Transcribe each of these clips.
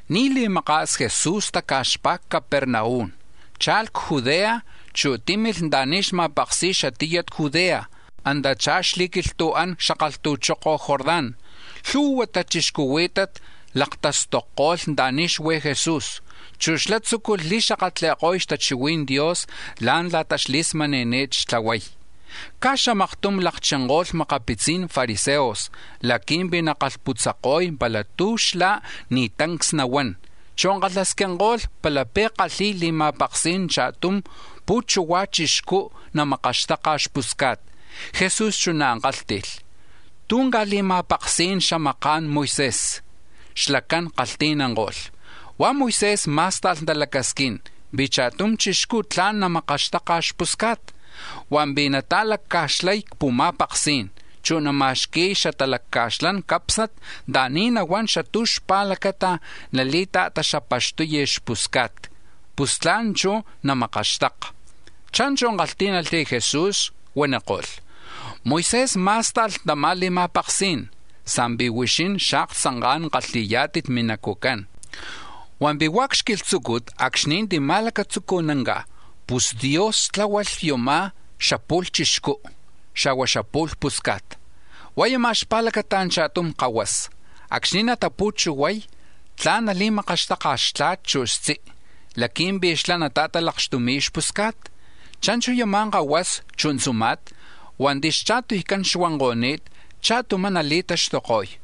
Ni̱ li̱maka̱s Jesús taca̱xpá̱ c-Capernaum, cha̱lh c-Judea, chu̱ tímilh anta̱ni̱ xma̱paksi̱y xatiyat Judea, antachá̱ xli̱quilhtu̱án c-xakalhtu̱choko̱ Jordán. Lhu̱hua tachixcuhuí̱tat laktastokpalako̱lh anta̱ni̱ xuí̱ Jesús, chu̱ xlá̱ tzúculh li̱xakatli̱ko̱y xtachihui̱n Dios la̱ntla̱ta xli̱smani̱ni̱t xtlahuay. Caj xamaktum lakchinko̱lh makapitzi̱n fariseos laqui̱mpi̱ nakalhputzako̱y pala tú̱ xlá̱ ni̱ tancs nahuán; chu̱ kalhasquinko̱lh palapi̱ kalhi̱y li̱ma̱paksí̱n cha̱tum pu̱chuhua̱ chixcú̱ namakaxtaka̱ xpusca̱t. Jesús chuná̱ kálhti̱lh: —¿Tú̱ ca̱li̱ma̱paksí̱n xamaka̱n Moisés? Xlacán kalhti̱nanko̱lh: —Hua̱ Moisés má̱sta̱lh talacasquín pi̱ cha̱tum chixcú̱ tla̱n namakaxtaka̱ xpusca̱t, hua̱mpi̱ nata̱lacca̱xlay c-pu̱ma̱paksí̱n, chu̱ nama̱xqui̱y xatalacca̱xlan cápsnat anta̱ni̱ nahuán xatú̱ xpa̱lacata̱ nali̱ta̱taxapaxtuy xpusca̱t, pus tla̱n chú̱ namakaxtaka. Cha̱nchu̱ kalhtí̱nalh Jesús, huaniko̱lh: —Moisés má̱sta̱lh tama̱ li̱ma̱paksí̱n, sa̱mpi̱ huixín xaktzanká̱n kalhi̱yá̱tit minacu̱cán. Hua̱mpi̱ hua̱ c-xquilhtzúcut acxni̱ tima̱lacatzucunanca̱, pus Dios tláhualh yama̱ xapu̱lh chixcú, xa̱hua̱ xapu̱lh pusca̱t. Hua̱ yumá̱ xpa̱lacata̱ cha̱tum kahuasa, acxni̱ natapu̱chuhuay, tla̱n nali̱makaxtaka̱ xtla̱t, chu̱ xtzi, laqui̱mpi̱ xlá̱ nata̱talakxtumi̱y xpusca̱t. Cha̱nchu̱ yama̱ kahuasa, chu̱ tzuma̱t hua̱nti̱ xcha̱tuycán xuanko̱ni̱t, cha̱tumá̱ nali̱taxtuko̱y.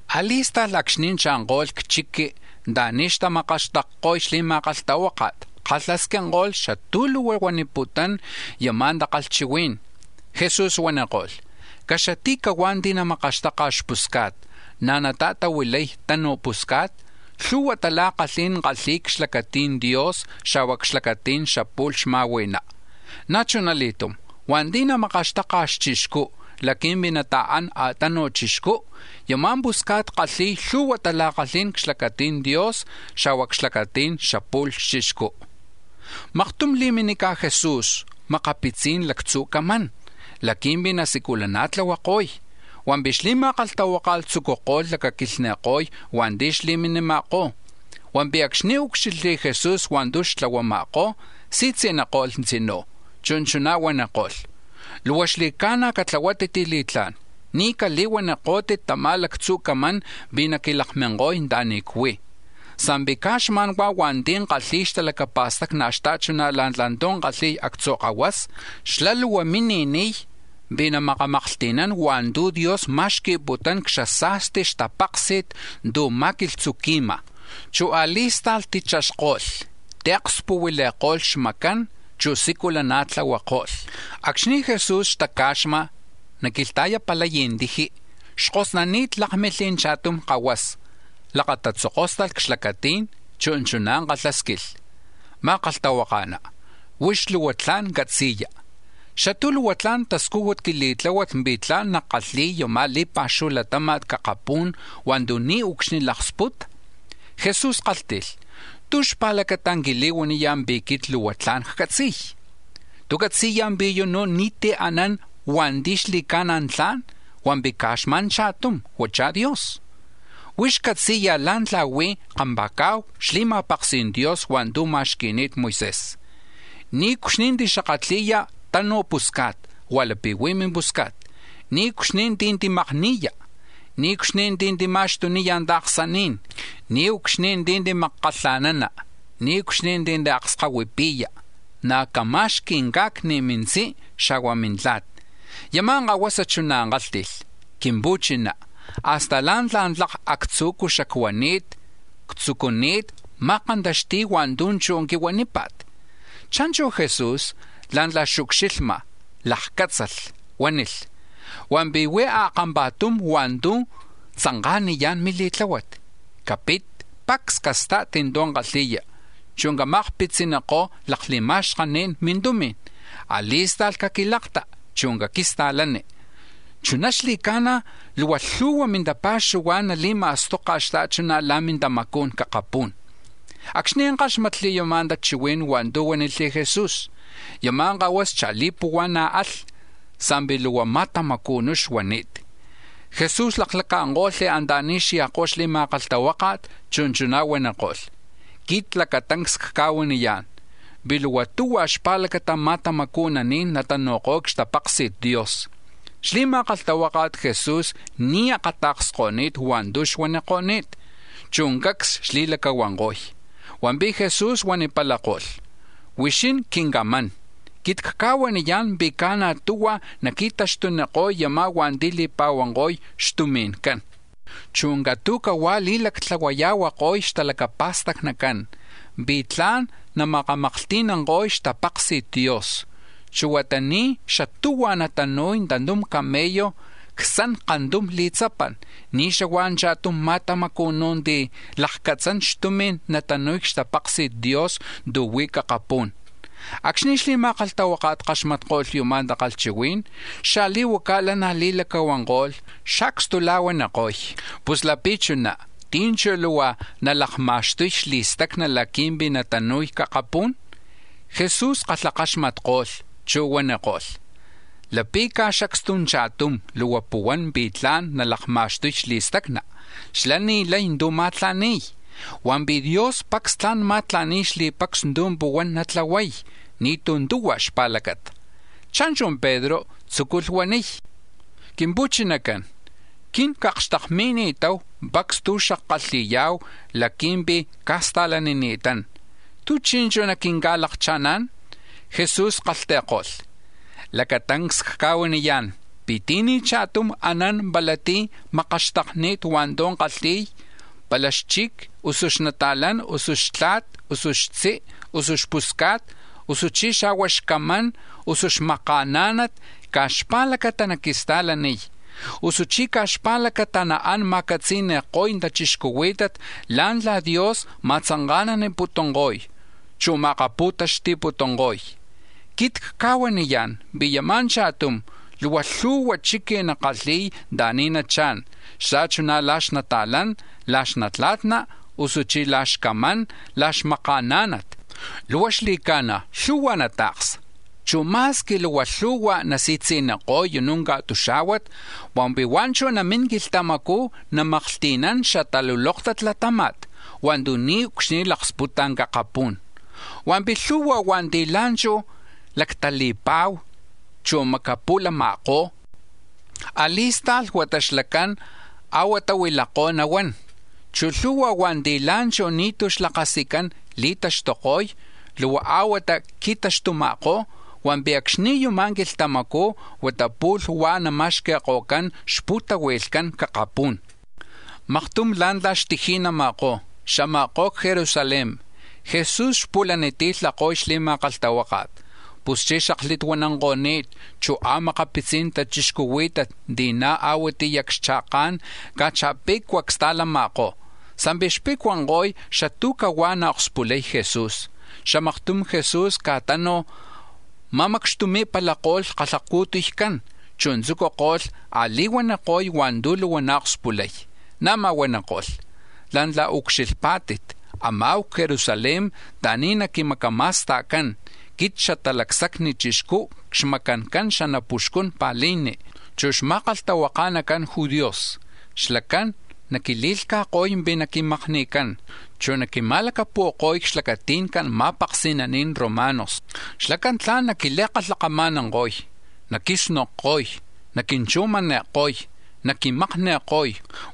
A̱li̱sta̱lh acxni̱ cha̱nko̱lh c-chiqui̱ anta̱ni̱ xtamakaxtakko̱y, xli̱ma̱kalhtahuáka̱t kalhasquinko̱lh xatú̱ luhua xuaniputún yama̱ takalhchihuí̱n. Jesús huaniko̱lh: —Caxati̱cahuá̱ ti̱ namakaxtaka̱ xpusca̱t, na̱ nata̱tahuilay tanuj pusca̱t, lhu̱hua tala̱kalhí̱n kalhi̱y c-xlacati̱n Dios, xa̱hua̱ c-xlacati̱n xapu̱lh xma̱hui̱ná. Na̱ chuna li̱tum, hua̱nti̱ makaxtaka̱ xchixcú̱ laqui̱mpi̱ nata̱án a̱tanuj chixcú, yama̱ pusca̱t kalhi̱y lhu̱hua tala̱kalhí̱n c-xlacati̱n Dios, xa̱hua̱ c-xlacati̱n xapu̱lh xchixcú. Maktum li̱minica̱ Jesús makapitzi̱n lactzu̱ camán laqui̱mpi̱ nasiculana̱tlahuako̱y, hua̱mpi̱ xli̱ma̱kalhtahuáka̱t tzucuko̱lh lacaquilhni̱ko̱y hua̱nti̱ xli̱minima̱kó̱. Hua̱mpi̱ acxni̱ úcxilhli̱ Jesús hua̱ntu̱ xtlahuama̱kó̱, si̱tzi̱niko̱lh tzinú̱, chu̱ chuná̱ huaniko̱lh: —Luhua xli̱ca̱na̱ catlahuátit li̱tlá̱n, ni̱ cali̱huanikó̱tit tama̱ lactzu̱ camán pi̱ naquilakminko̱y anta̱ni̱ cuí̱, sa̱mpi̱ caj xma̱n huá̱ hua̱nti̱ kalhi̱y xtalacapa̱stacni̱ xta̱chuná̱ la̱ntla̱ tu̱ kalhi̱y actzu̱ kahuasa, xlá̱ luhua mini̱niy pi̱ namakamaklhti̱nán hua̱ntu̱ Dios ma̱xqui̱putún, c-xasa̱sti xtapáksi̱t tu̱ ma̱quilhtzuqui̱ma̱. Chu̱ a̱li̱sta̱lh tichaxko̱lh, tiakspu̱huili̱ko̱lh xmacán, chu̱ siculana̱tlahuako̱lh. Acxni̱ Jesús xtaca̱xma̱ naquilhta̱yapalay tiji, xkosnani̱t lákmilh cha̱tum kahuasa, lakatatzokóstalh c-xlacatí̱n, chu̱ chuná̱ kalhásquilh: —Ma̱kalhtahuaka̱ná, huix luhua tla̱n catzi̱ya, ¿xatú̱ luhua tla̱n tascújut quili̱tláhuat pi̱ tla̱n nackalhi̱y yama̱ li̱pa̱xuhu latáma̱t c-akapú̱n hua̱ntu̱ niucxni̱ nalaksputa? Jesús kálhti̱lh: —¿Tú̱ xpa̱lacata̱ quili̱huaniya̱ pi̱ quit luhua tla̱n ccatzi̱y? ¿Tú̱ catzi̱ya̱ pi̱ yunú̱ ni̱tí̱ anán hua̱nti̱ xli̱ca̱na̱ tla̱n, hua̱mpi̱ caj xma̱n cha̱tum, huachá̱ Dios? Huix catzi̱ya̱ la̱ntla̱ huí̱ kampa̱ca̱hu xli̱ma̱paksi̱n Dios hua̱ntu̱ ma̱xqui̱ni̱t Moisés: ‘Niucxni̱ tixakatli̱ya̱ tanuj pusca̱t lapi̱ huí̱ mimpusca̱t; niucxni̱ tí̱ timakni̱ya̱; niucxni̱ tí̱ tima̱xtuniya̱ ta̱ksaní̱n, niucxni̱ tí̱ timakkalha̱nana; niucxni̱ tí̱ tiakskahuipi̱ya; na̱ cama̱xqui̱ ca̱cni̱ mintzí, xa̱hua̱ mintla̱t.’ Yama̱ kahuasa chuná̱ kálhti̱lh: —Quimpu̱chiná, hasta la̱ntla̱ tlak actzu̱cú̱ xacuani̱t ctzucuni̱t ma̱kantaxti̱y hua̱ntu̱ chú̱ huanípa̱t. Cha̱nchu̱ Jesús, la̱ntla̱ xucxilhma̱, lakcátzalh, huánilh: —Hua̱mpi̱ huí̱ a̱kampa̱tum hua̱ntu̱ tzanka̱niyá̱n mili̱tláhuat: capit, pacs casta̱t tu̱ kalhi̱ya, chu̱ cama̱akpitzinikó̱ lakli̱ma̱xkaní̱n mintumi̱n, a̱li̱sta̱lh caquilakta, chu̱ caquista̱lani; chuná xli̱ca̱na̱ luhua lhu̱hua̱ mintapa̱xuhuá̱n nali̱ma̱stoka̱ xta̱chuná̱ la̱ mintamacú̱n c-akapú̱n. Acxni̱ káxmatli̱ yama̱ tachihuí̱n hua̱ntu̱ huánilh Jesús, yama̱ kahuasa cha̱li̱puhua̱na̱ alh, sa̱mpi̱ luhua ma̱tamacu̱nú̱ xuani̱t. Jesús laklaca̱nko̱lh anta̱ni̱ xya̱kó̱ xli̱ma̱kalhtahuáka̱t, chu̱ chuná̱ huaniko̱lh: —Quit lacatancs cca̱huaniyá̱n pi̱ luhua tuhua̱ xpa̱lacata̱ ma̱tamacu̱naní̱n natanu̱ko̱y c-xtapaksi̱t Dios. Xli̱ma̱kalhtahuaka̱t Jesús ni̱ xakata̱ksko̱ni̱t hua̱ntu̱ xuaniko̱ni̱t, chu̱ cacs xli̱lacahuanko̱y, hua̱mpi̱ Jesús huanipalako̱lh: —Huixín quincamán, quit cca̱huaniyá̱n pi̱ ca̱na̱ tuhua̱ naqui̱taxtuniko̱y yamá̱ hua̱nti̱ li̱pa̱huanko̱y xtumi̱ncán, chu̱ catu̱cahuá̱ li̱lactlahuaya̱huako̱y xtalacapa̱stacnicán pi̱ tla̱n namakamaklhti̱nanko̱y xtapaksi̱t Dios. Chu̱ huata ni̱ xatuhua̱ natanu̱y tantum camello c-xtzan kantum li̱tzapan, ni̱ xahua̱ cha̱tum ma̱tamacu̱nú̱ ti̱ lakcatzán xtumi̱n natanu̱y c-xtapaksi̱t Dios tu̱ huí̱ c-akapú̱n. Acxni̱ xli̱ma̱kalhtahuáka̱t kaxmatko̱lh yuma̱ takalhchihuí̱n, xaa̱i̱huacá̱ lanaj li̱lacahuanko̱lh, xacstula̱huaniko̱y: —Pus lapi̱ chuná, ¿tí̱ chú̱ luhua nalakma̱xtuy xli̱stacna̱ laqui̱mpi̱ natanu̱y c-akapú̱n? Jesús kalhakaxmatko̱lh, chu̱ huaniko̱lh: —Lapi̱ caj xacstu cha̱tum luhua puhuán pi̱ tla̱n nalakma̱xtuy xli̱stacna, xlá̱ ni̱ lay tú̱ ma̱tla̱ni̱y; hua̱mpi̱ Dios pacs tla̱n ma̱tla̱ni̱y xli̱pacs tu̱ puhuán natlahuay, ni̱tú̱ tuhua̱ xpa̱lacata. Cha̱nchu̱ Pedro, tzúculh huaniy: —Quimpu̱chinacán, quin cakxtakmakani̱tahu pacs tu̱ xackalhi̱ya̱hu laqui̱mpi̱ cca̱sta̱lanini̱tán, ¿tú̱ chi̱nchu̱ naquinca̱lakcha̱ná̱n? Jesús kalhti̱ko̱lh: —Lacatancs cca̱huaniyá̱n, pi̱ ti̱ni̱ cha̱tum anán pala tí̱ makaxtakni̱t hua̱ntu̱ kalhi̱y, pala xchic, usu xnata̱lán, usu xtla̱t, usu xtzi, usu xpusca̱t, usuchí̱ xa̱hua̱ xcamán, usu xpú̱cuxtu, caj xpa̱lacata naquista̱laniy, usuchí̱ caj xpa̱lacata naán ma̱catzi̱ni̱ko̱y tachixcuhuí̱tat la̱ntla̱ Dios ma̱tzanka̱naniputunko̱y, chu̱ ma̱akapu̱taxti̱putunko̱y. Quit cca̱huaniyá̱n pi̱ yama̱ cha̱tum, luhua lhu̱hua chiqui̱ nakalhi̱y anta̱ni̱ nachá̱n, xta̱chuná̱ la̱ xnata̱lán, la̱ xnatla̱tna, usuchí̱ la̱ xcamán, la̱ xmakaaná̱nat. Luhua xli̱ca̱na̱ lhu̱hua̱ nata̱ksa, chu̱ ma̱squi luhua lhu̱hua̱ nasi̱tzi̱niko̱y yunú̱ ca̱tuxá̱huat, hua̱mpi̱ huá̱ chú̱ namín quilhtamacú̱ namaklhti̱nán xataluloktat latáma̱t hua̱ntu̱ niucxni̱ laksputa̱ c-akapú̱n. Hua̱mpi̱ lhu̱hua̱ hua̱nti̱ la̱nchú̱ lactali̱pa̱hu, chu̱ macapu̱lama̱kó̱, a̱li̱sta̱lh huata xlacán a̱huatá̱ huilakoj nahuán; chu̱ lhu̱hua̱ hua̱nti̱ la̱nchú̱ ni̱tú̱ xlakasicán li̱taxtuko̱y, luhua a̱huatá̱ qui̱taxtuma̱kó̱; hua̱mpi̱ acxni̱ chú̱ yama̱ quilhtamacú̱ huata pu̱lh huá̱ nama̱xqui̱ko̱cán xpu̱tahui̱lhcán c-akapú̱n. Maktum la̱ntla̱ xtiji̱nama̱kó̱, xama̱kó̱ c-Jerusalén; Jesús xpu̱laniti̱lhako̱y xli̱ma̱kalhtahuáka̱t. Puschí̱ xaklituananko̱ni̱t, chu̱ a̱makapitzi̱n tachixcuhuí̱tat ti̱ na̱ a̱huatiyá̱ c-xcha̱ká̱n caj cha̱pe̱cua̱ csta̱lama̱kó̱, sa̱mpi̱ xpe̱cuanko̱y xatú̱ cahuá̱ naakspulay Jesús. Xamaktum Jesús caj tánuj ma̱macxtumi̱palako̱lh xkalhacu̱tuycán, chu̱ tzúculh a̱li̱huaniko̱y hua̱ntu̱ luhua naakspulay. Na̱má̱ huaniko̱lh: “La̱ntla̱ ucxilhpá̱tit, ama̱hu c-Jerusalén anta̱ni̱ naquimacama̱sta̱cán, quit Xatalacsacni Chixcú, c-xmacancan xanapuxcun pa̱lijni, chu̱ xma̱kalhtahuaka̱nacan Judíos; xlacán naquili̱lhca̱ko̱y pi̱ naquimakni̱cán, chu̱ naquima̱lacapu̱ko̱y c-xlacati̱ncan ma̱paksi̱nani̱n romanos. Xlacán tla̱n naquili̱kalhakama̱nanko̱y, naquisnokko̱y, naquinchujmani̱ko̱y, naquimakni̱ko̱y.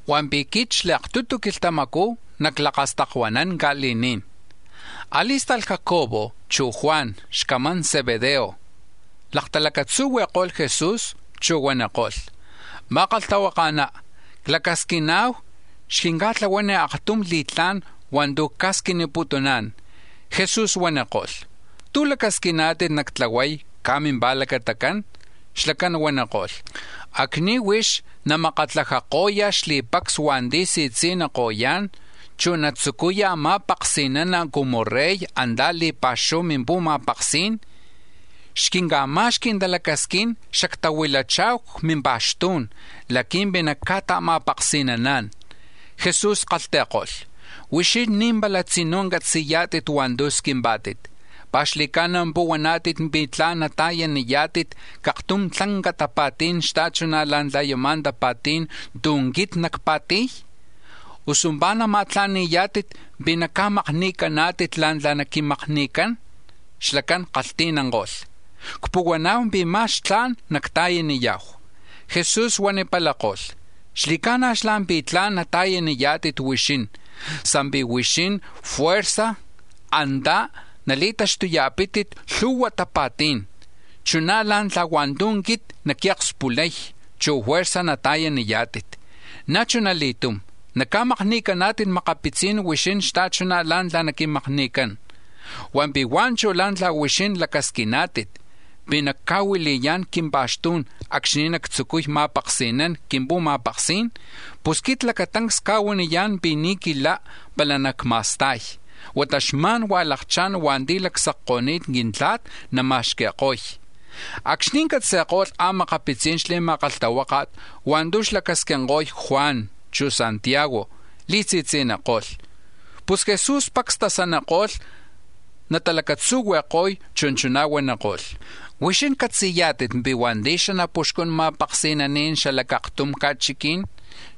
Hua̱mpi̱ quit xli̱aktutu quilhtamacú̱ naclakastakuanán ca̱li̱ní̱n.” A̱li̱sta̱lh Jacobo, chu̱ Juan, xcamán Zebedeo, laktalacatzuhui̱ko̱lh Jesús, chu̱ huaniko̱lh: —Ma̱kalhtahuaka̱ná, clacasquina̱hu xquinca̱tlahuani̱ aktum li̱tlá̱n hua̱ntu̱ cca̱squimputuná̱n. Jesús huaniko̱lh: —¿Tú̱ lacasquiná̱tit nactlahuay caj mimpa̱lacatacán? Xlacán huaniko̱lh: —Acxni̱ huix namakatlajako̱ya̱ xli̱pacs hua̱nti̱ si̱tzi̱nikoyá̱n, chu̱ natzucuya ma̱paksi̱nana̱ cumu tlanca Rey antá̱ c-li̱pa̱xuhu mimpu̱ma̱paksí̱n, xquinca̱ma̱xqui̱ talacasquín xactahuilacha̱hu c-mimpa̱xtú̱n laqui̱mpi̱ nacca̱ta̱ma̱paksi̱naná̱n. Jesús kalhti̱ko̱lh: —Huixín ni̱ pala tzinú̱ catzi̱yá̱tit hua̱ntu̱ squimpá̱tit. ¿Pi̱ xli̱ca̱na̱ puhuaná̱tit pi̱ tla̱n nata̱yaniyá̱tit c-aktum tlanca tapa̱tí̱n xta̱chuná̱ la̱ntla̱ yama̱ tapa̱tí̱n tu̱ quit nacpa̱ti̱y? Usu ¿pi̱ nama̱tla̱ni̱yá̱tit pi̱ naca̱makni̱caná̱tit la̱ntla̱ naquimakni̱cán? Xlacán kalhti̱nanko̱lh: —Cpuhuana̱hu pi̱ ma̱x tla̱n nacta̱yaniya̱hu. Jesús huanipalako̱lh: —Xli̱ca̱na̱ xlá̱ pi̱ tla̱n nata̱yaniyá̱tit huixín, sa̱mpi̱ huixín fuerza̱ antá̱ nali̱taxtuya̱pítit lhu̱hua tapa̱tí̱n chuná̱ la̱ntla̱ hua̱ntu̱ quit naquiakspulay, chu̱ fuerza̱ nata̱yaniyá̱tit; na̱ chuna li̱tum naca̱makni̱caná̱tit makapitzi̱n huixín xta̱chuná̱ la̱ntla̱ naquimakni̱cán. Hua̱mpi̱ hua̱ chú̱ la̱ntla̱ huixín lacasquiná̱tit pi̱ nacca̱huili̱yá̱n c-quimpa̱xtú̱n acxni̱ nactzucuy ma̱paksi̱nán c-quimpu̱ma̱paksí̱n, pus quit lacatancs cca̱huaniyá̱n pi̱ ni̱ quilá̱ pala nacma̱sta̱y, huata xma̱n huá̱ lakchá̱n hua̱nti̱ lacsacko̱ni̱t Quintla̱t nama̱xqui̱ko̱y. Acxni̱ catzi̱ko̱lh a̱makapitzi̱n xli̱ma̱kalhtahuáka̱t hua̱ntu̱ xlacasquinko̱y Juan, chu̱ Santiago, li̱si̱tzi̱niko̱lh. Pus Jesús pacs tasaniko̱lh natalacatzuhui̱ko̱y, chu̱ chuná̱ huaniko̱lh: —Huixín catzi̱yá̱tit pi̱ hua̱nti̱ xanapuxcun ma̱paksi̱naní̱n xala c-aktum ca̱chiquí̱n,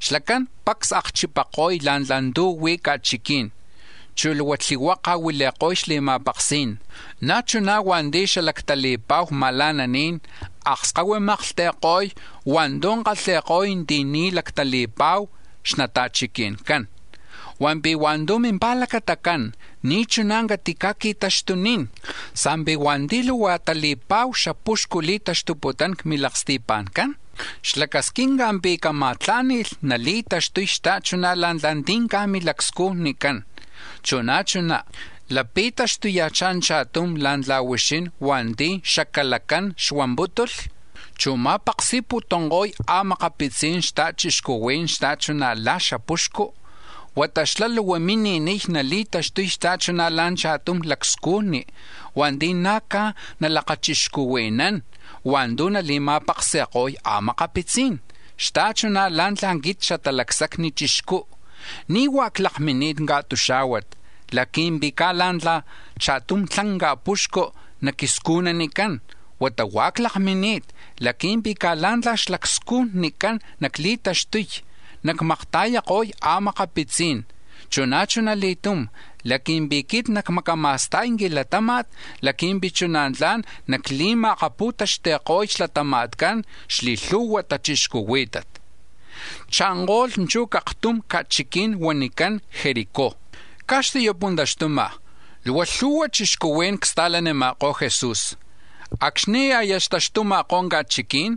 xlacán pacs akchipako̱y la̱ntla̱ tu̱ huí̱ ca̱chiquí̱n, chu̱ luhua tlihuaka̱ huili̱ko̱y xli̱ma̱paksí̱n, na̱ chuná̱ hua̱nti̱ xalactali̱pa̱hu ma̱la̱naní̱n akskahuimaklhti̱ko̱y hua̱ntu̱ kalhi̱ko̱y ti̱ ni̱ lactali̱pa̱hu xnata̱chiqui̱ncán. Hua̱mpi̱ hua̱ntu̱ mimpa̱lacatacán ni̱ chuná̱ catica̱qui̱taxtunín, sa̱mpi̱ hua̱nti̱ luhua tali̱pa̱hu xapuxcu li̱taxtuputún c-milaksti̱pa̱ncán, xlacasquinca̱ pi̱ cama̱tlá̱ni̱lh nali̱taxtuy xta̱chuná̱ la̱ntla̱ ti̱ caj milacscujnicán. Chu̱ na̱ chuná̱ lapi̱ taxtuya̱chá̱ cha̱tum la̱ntla̱ huixín hua̱nti̱ xacalacán xuampútulh, chu̱ ma̱paksi̱putunko̱y a̱makapitzi̱n xta̱chixcuhuí̱n xta̱chuná̱ la̱ntla̱ xapuxcu, huata xlá̱ luhua mini̱niy nali̱taxtuy xta̱chuná̱ la̱ cha̱tum lacscujni̱ hua̱nti̱ na̱ caj nalakachixcuhui̱nán hua̱ntu̱ nali̱ma̱paksi̱ko̱y a̱makapitzí̱n. Xta̱chuná̱ la̱ntla̱ quit Xatalacsacni Chixcú̱ ni̱ huá̱ clakmini̱t ca̱tuxá̱huat laqui̱mpi̱ caj la̱ntla̱ cha̱tum tlanca̱ puxcu̱ naquiscujnanicán, huata huá̱ clakmini̱t laqui̱mpi̱ caj la̱ntla̱ xlacscujnicán nacli̱taxtuy nacmakta̱yako̱y a̱makapitzí̱n, chu̱ na̱ chuna li̱tum, laqui̱mpi̱ quit nacmacama̱sta̱y quilatáma̱t laqui̱mpi̱ chuná̱ tla̱n nacli̱ma̱akapu̱taxti̱ko̱y xlatama̱tcan xli̱lhu̱hua tachixcuhuí̱tat. Cha̱nko̱lh chú̱ c-aktum ca̱chiquí̱n huanicán Jericó, caj xti̱yapuntaxtuma̱kó̱, luhua lhu̱hua̱ chixcuhuí̱n csta̱lanima̱kó̱ Jesús. Acxni̱ aya xtaxtuma̱kó̱ ca̱chiquí̱n,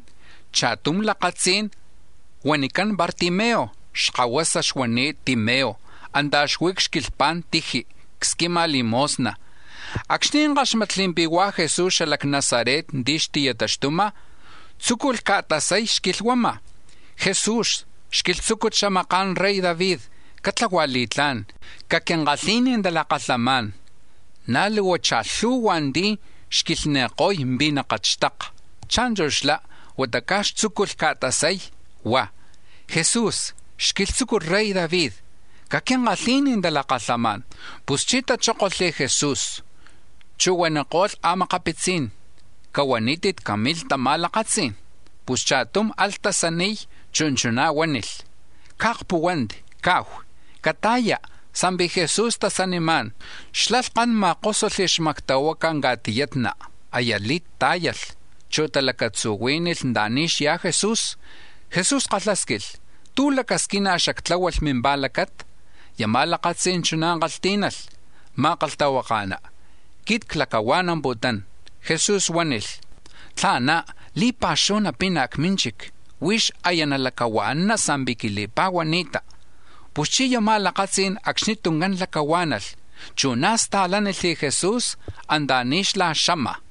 cha̱tum lakatzí̱n huanicán Bartimeo, xkahuasa xuani̱t Timeo, antá̱ xuí̱ c-xquilhpa̱n tiji, csquima̱ limosna. Acxni̱ káxmatli̱ pi̱ hua̱ Jesús xala c-Nazaret ti̱ xti̱taxtuma̱, tzúculh ca̱tasay, xquilhuama̱: —Jesús, xquilhtzúcut xamaka̱n rey David, catlahua̱ li̱tlá̱n, caquinkalhi̱ni̱ talakalhamá̱n. Na̱ luhua cha̱lhu̱hua̱ ti̱ xquilhni̱ko̱y pi̱ nakatxtaka; cha̱nchu̱ xlá, huata ca̱x tzúculh ca̱tasay, huá̱: —Jesús, xquilhtzucut rey David, caquinkalhi̱ni̱ talakalhamá̱n. Puschí̱ tachókolh Jesús, chu̱ huaniko̱lh a̱makapitzí̱n: —Cahuanítit camilh tama̱ lakatzí̱n. Pus cha̱tum alh tasaniy, chu̱ chuná̱ huánilh: —Caakpúhuanti, kahu; cata̱ya, sa̱mpi̱ Jesús tasanimá̱n. Xlá̱ lhkan ma̱kósulh xmactahuaca̱ ca̱tiyatna, aya lit tá̱yalh, chu̱ talacatzúhui̱lh anta̱ni̱ xyá̱ Jesús. Jesús kalhásquilh: —¿Tú̱ lacasquina̱ xactláhualh mimpa̱lacata? Yama̱ lakatzí̱n chuná̱ kalhtí̱nalh: —Ma̱kalhtahuaka̱ná, quit clacahua̱namputún. Jesús huánilh: —Tla̱ná̱ li̱pa̱xuhu napina̱ c-mínchic. Huix aya nalacahua̱nana sa̱mpi̱ quili̱pa̱huani̱ta. Puschí̱ yama̱ lakatzí̱n acxni tuncán lacahuá̱nalh, chu̱ na̱ sta̱lánilh Jesús anta̱ni̱ xlá̱ xama̱.